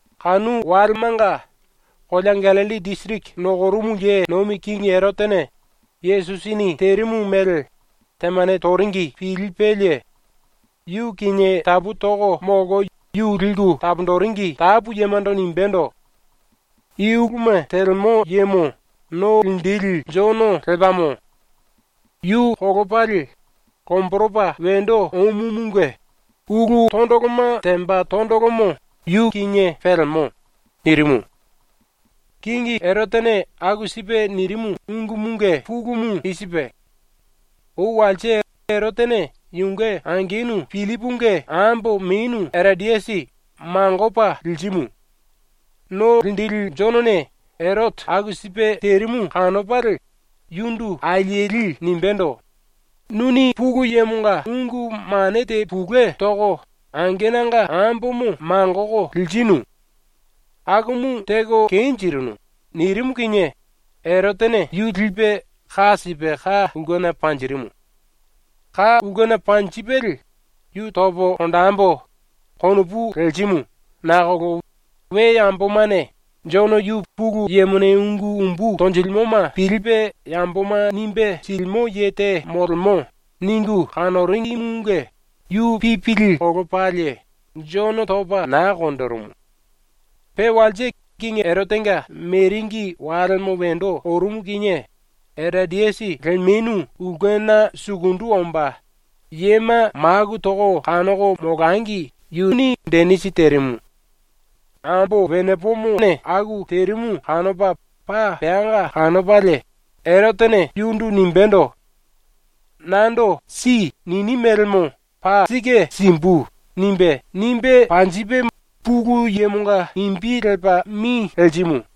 Kanu walemanga kolea Gallilli disiriki nokorumu ye nomi kingi Erotene Yesusini terimu mele temane toringi pilipelie yu kinie tapu toko molko yu liku taponjiringi tapu yemando nimbendo: “I uluma telemo yemo No Linjili Jono lepamo! Yu kolopalie lomboropa wendo omumunge ulu tondoloma temba tondolomo yu kinie pelemo.” nirimu. ⸤Kingi Erotene aku sipe nirimu ungumunge pulumu i sipe:⸥ Ou walse Erotene yunge angenu Pillipunge ambo menu Erodiasi mangopa lirimu. ⸤No Linjili⸥ Jonone Erote aku sipe terimu kanopalie yundu alieli nimbendo: “Nuni ⸤Pulu Yemonga⸥ ungu mane te pulue toko angenanga ambomo mangoko lirinu. Akumu teko kenjirinu.” nirimu kinie Erotene yu lipe ka sipe ka ulkena panjirimu. Ka ulkena panjipelie ‘Yu topo konjembo.’ konopu lerimu nakolo we yambomane ‘Jono yu Pulu Yemone ungu umbu tonjilimoma pilipe yamboma nimbe silimo ye te molemo.’ ningu kanoringimunge yu pipili kolopalie Jono topa na konjirimu. Pe walse kingi Erotenga meringi walemo wendo orumu kinie Erodiasi lemenu ulkena sukundu omba, yema maku toko kanoko molangi yu denisi terimu. Erotene ambo wenepomo aku terimu kanopa paa peanga kanopalie yundu nimbendo: “Nando “Si.” nini melemo paa sike simbu.” nimbe, nimbe panjipe Pulu Yemonga imbi lepa mi lerimu.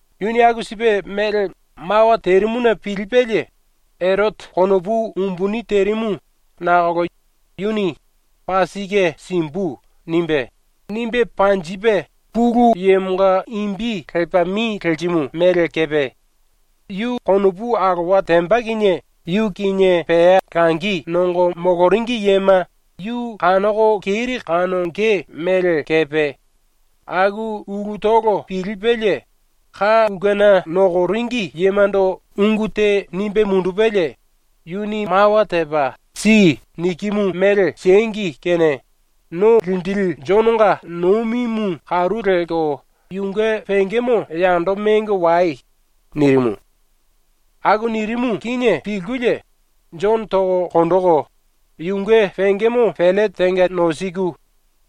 Yuni aku sipe mele mawa terimuna pilipelie Erote konopu umbuni terimu nakolo yuni “Paa sike simbu.” nimbe, nimbe panjipe Pulu Yemonga imbi lepa mi lerimu mele kepe, yu konopu alowa temba kinie yu kinie pea langi nongo moloringi yema yu kanoko keri kanonge mele kepe, aku ulutolo pilipelie, ka ulkena nokoringi yemando ungu te nimbe mundupelie “Yuni mawa tepa “Si.” nikimu mele siengi kene ⸤No Linjili⸥ Jononga ⸤nomimu karu lelko yunge⸥ pengemo yando mengo wai.” nirimu. Aku nirimu kinie pilkulie Jono toko konjiku, yunge pengemo pellete tenga nosiku,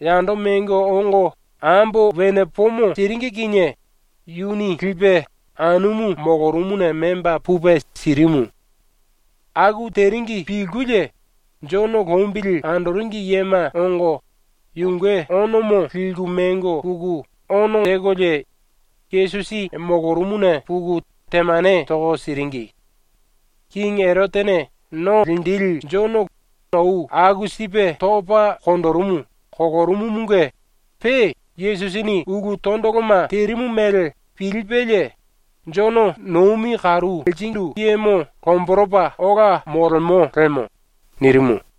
yando mengo ongo ambo wenepomo siringi kinie yuni lipe anumu molorumuna memba pupe sirimu. Aku teringi pilkulie Jono lombili andoringi yema ongo yunge onomo liku mengo puku ono tekolie Yesusi molorumuna puku temane toko siringi. ⸤Kingi Erotene No Linjili Jono ou aku sipe topa konjirimu kolorumumunge pe Yesusini ulu tondoloma terimu mele pilipelie “Jono nomi karu lerindu yemo lomboropa ola molemo lemo.” nirimu.⸥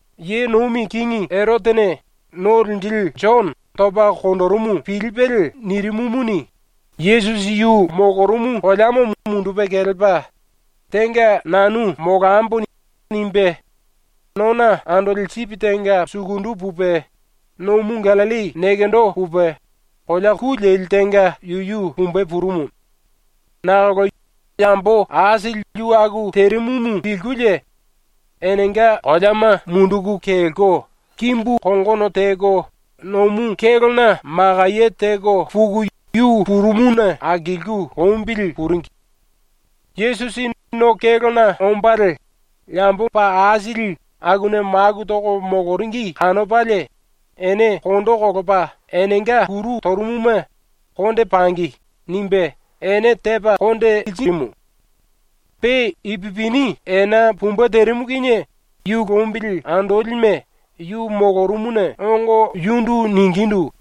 ⸤Ye nomi kingi⸥ Erotene No Linjili Jono topa konjirimu pilipelie nirimumuni, Yesusi yu molorumu koleamo mundupe kelepa ‘Tenga nanu molambo.’ nimbe nona andoli sipi tenga sukundu pupe nomu ⸤Gallilli⸥ nekendo pupe kolea ku leli tenga yuyu pumbe purumu. Nakolo yambo aisili yu aku terimumu pilkulie enenga koleama munduku kelko kimbu kongono teko nomu kélona makaye teko puku yu purumuna akilku lombili puringi. Yesusi no kélona ombalie yambo paa aisili akuna maku toko moloringi kanopalie ene kondo kolopa enenga kuru torumuma ‘Konde pangi.’ nimbe ene tepa konde lirimu. Pe ipupini ena pumbe terimu kinie yu lombili andolime yu molorumuna ongo yundu ningindu: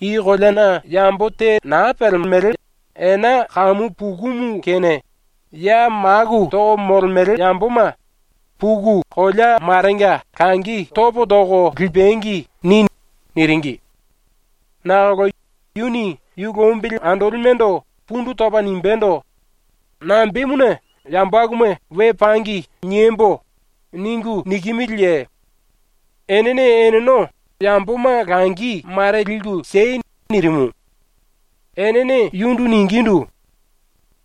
“I koleana yambo te naa pelemo, ena kamu pukumu kene ya maku toko molemele yamboma ‘Puku kolea marenga langi topo toko lipangi.’ ni.” niringi. Nakolo yuni yu lombili andolimendo pundu topa nimbendo: “Nambemuna ‘yambo akuma ‘We pangi.’ niembo.’ ningu nikimiliye? Enene eneno yamboma langi mare liku siei.” nirimu. Enene yundu ningindu: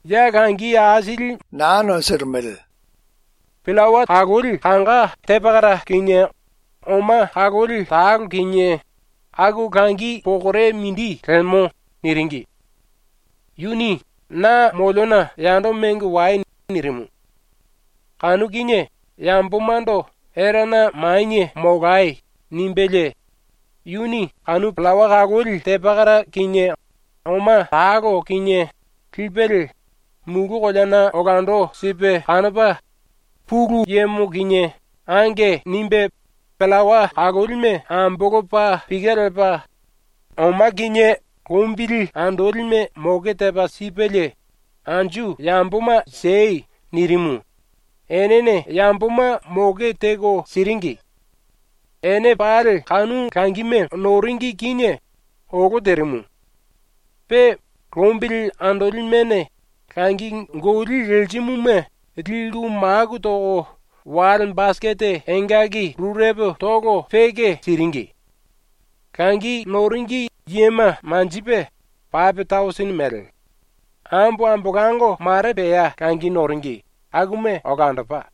“Ya langi aisili molo. Pillawa kaloli kanga te pakara kinie oma kaloli talo kinie aku langi pokore mindi lemo.” niringi. Yuni “Na moliona yando mengo wai.” nirimu. Kanu kinie yambomando “Erana manie molai.” nimbelie yuni kanu pillawa kaloli te pakara kinie oma talo kinie lipelie mulu koleana olando sipe kanopa ⸤Pulu Yemo kinie⸥ “Ange.” nimbe pillawa kalolime ambolopa pike lepa ⸤oma kinie⸥ lombili andolime moke tepa sipelie “Anju yamboma siei.” nirimu, enene yamboma moke teko siringi. Ene pali kanu langime noringi kinie olo terimu. Pe lombili andolimene langi goli lerimuma liku maku toko wale basikete engaki rurepo toko peke siringi. Langi noringi yema manjipe pape tausini mele. Ambo ambolango ⸤mare pea langi noringi⸥ akuma olandopa.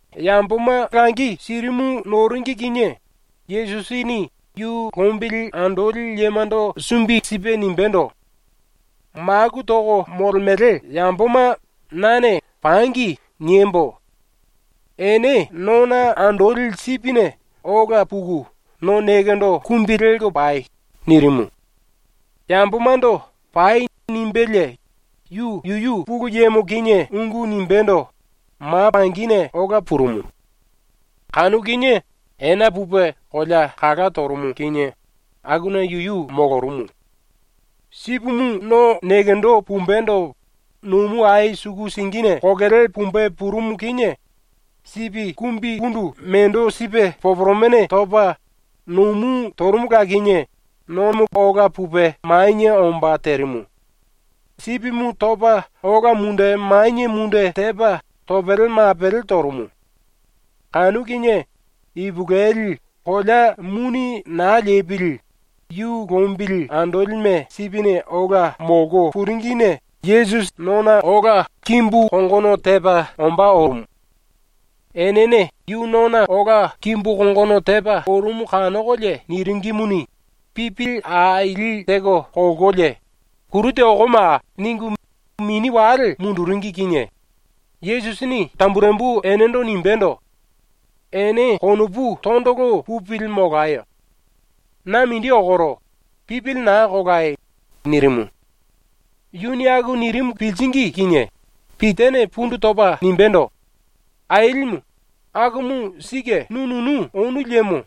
⸤Yamboma langi sirimu noringi⸥ kinie Yesusini yu lombili andoli yemando sumbi sipe nimbendo: “Maku toko molemele yamboma nane “Pangi.” niembo. Ene nona andoli sipine ola puku no nekendo kumbi lelko pai.” nirimu. Yambomando “Pai.” nimbelie yu yuyu Pulu Yemo kinie ungu nimbendo ma pangine ola purumu. Kanu kinie ena pupe kolea kala torumu kinie akuna yuyu molorumu. Sipimu no nekendo pumbendo nomu ai suku singine kokele pumbe purumu kinie sipi kumbikundu mendo sipe poporomene topa, nomu torumula kinie nomo ola pupe manie omba terimu, sipimu topa ola munde manie munde tepa topele mapele torumu. Kanu kinie ipulueli kolea muni naa lepili ⸤yu lombili andolime sipine ola molko⸥ puringine Yesusi nona ola kimbu kongono tepa ombá orumu. Enene yu nona ola kimbu kongono tepa orumu kanokolie niringimuni, pipili aili teko kolkolie “Kuru te okomaa!” ningu mini wale munduringi kinie Yesusini tamburembu enendo nimbendo: “Ene konopu tondolo pupili molayo. Na mindi okoro. Pipili naa kolai.” nirimu. ⸤Yuni aku nirimu piliringi kinie⸥ Pitane pundu topa nimbendo: “Ailimu, akumu sike nu nunu onu liemo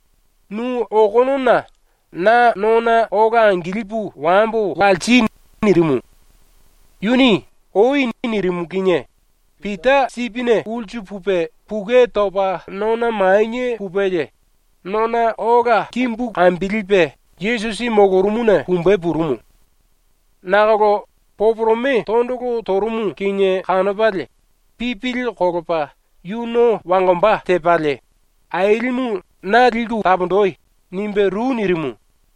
nu okonona na nona ola angilipu wambo walsi.” nirimu. Yuni “Oi.” nirimu kinie Pita sipine ulsu pupe pukue topa nona manie pupelie nona ola kimbu kambilipe Yesusi molorumuna pumbe purumu. Nakolo poporome tondolo torumu kinie kanopalie pipili kolopa yu no wangomba tepalie, “Ailimu, na liku taponji!” nimbe ru nirimu.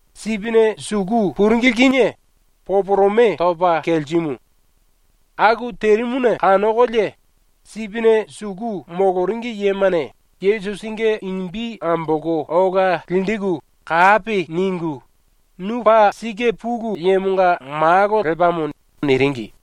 Sipine suku puringili kinie poporome topa kelerimu. Aku terimuna kanokolie sipine suku moloringi yemane Yesusinge imbi ambolko ola linjiku kapi ningu “Nu paa sike Pulu Yemonga Malo lepamo.” niringi.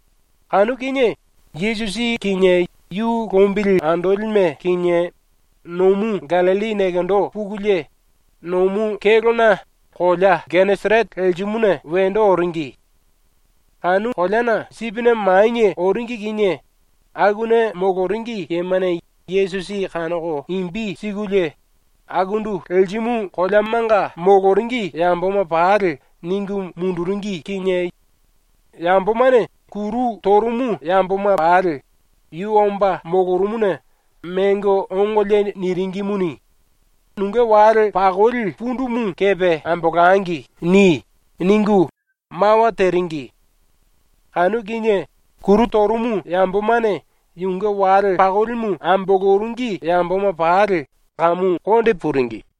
Kanu kinie ⸤Yesusi kinie yu lombili andolime kinie⸥ nomu ⸤Gallilli⸥ nekendo pukulie nomu kélona kolea Geneserete lerimuna wendo oringi. ⸤Kanu koleana sipine manie oringi kinie⸥ akuna moloringi yemane Yesusi kanoko imbi sikulie akundu lerimu koleamanga moloringi yamboma pali ningu munduringi kinie yambomane kuru torumu yamboma pali yu omba molorumuna mengo ongolie niringimuni, “‘Nunge wale pakoli pundumu kepe ambolangi.’ ni.” ningu mawa teringi. Kanu kinie kuru torumu yambomane yunge wale pakolimu amboloringi yamboma pali kamu konde puringi.